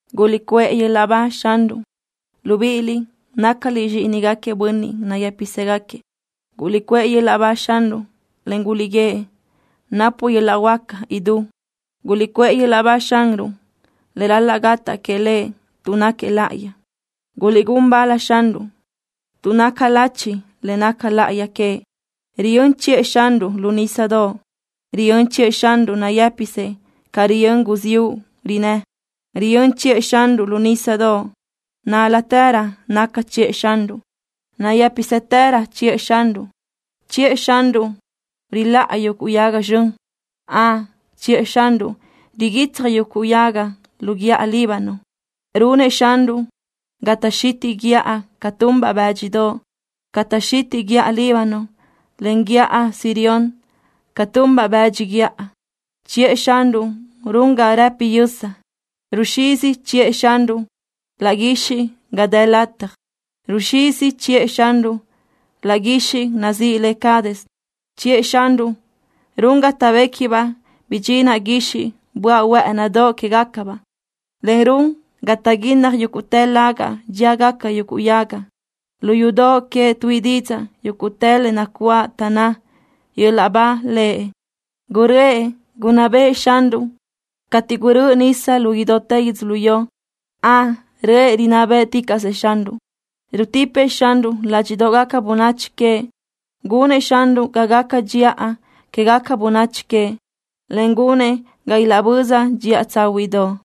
¡Guliʼcuʼë yöl-laʼ ba Xanruʼ, libíʼiliʼ, nácaliʼ zxíʼinigaquiëʼ bönniʼ nayë́pisëgaquiëʼ! ¡Guliʼcuʼë yöl-laʼ ba Xanruʼ, en guliʼguíëʼ: “Napuʼ yöl-laʼ huáca idú”! ¡Guliʼcuʼë yöl-laʼ ba Xanruʼ le ral-laʼ gataʼ que Lëʼ tuʼ náquiëʼ láʼayi! ¡Guliʼgún bal Xanruʼ, tuʼ naca lachi le naca láʼayi queëʼ! Riyö́n chiʼë Xanruʼ lu nísadoʼ. Riyö́n chiʼë Xanruʼ nayë́pisëʼ ca riyö́n guziúʼ rinnë́. Riyö́n chiʼë Xanruʼ lu nísadoʼ. Nál-latërö naca chiʼë Xanruʼ. Nayë́pisëtërö chiʼë Xanruʼ. Chiʼë Xanruʼ riláʼa yuguʼ yaga zxön. Ön, chiʼë Xanruʼ riguitsaj yuguʼ yaga lu guíʼa Líbano. Runëʼ Xanruʼ ga taʼxitiʼ guíʼa ca tunbaʼ bë́dxidoʼ. Taʼxitiʼ guíʼa Líbano, en guíʼa Sirión ca tunbaʼ bëdx guíʼa. Chiʼë Xanruʼ run ga rëpi yösa. Ruxizi chiʼë Xanruʼ laʼ guixiʼ ga dë lataj. Ruxizi chiʼë Xanruʼ laʼ guixiʼ nazíʼi le Cades. Chiʼë Xanruʼ run ga taʼbéquibaʼ bidxinaʼ guixiʼ böaʼ huë́ʼënidoʼ quégacabaʼ, en run ga taʼguínnaj yúguʼtë lagaʼ dxíagaca yuguʼ yaga. Lu yudoʼ queëʼ tuíʼi didzaʼ yúguʼtë le nacuáʼ, taʼnná: “¡Yöl-laʼ ba Lëʼ!” Guröʼë gunná bëʼë Xanruʼ cateʼ gurö́ʼö nisa lu idútë yödzölió. Ön, röʼë rinná bë́ʼticaʼsëʼ Xanruʼ. Rutipëʼ Xanruʼ ládxiʼdoʼgaca bönachi queëʼ. Gunëʼ Xanruʼ ga gaca dxiʼa quégaca bönachi queëʼ, en gunëʼ ga ilaʼböza dxiʼa tsáhuiʼdoʼ.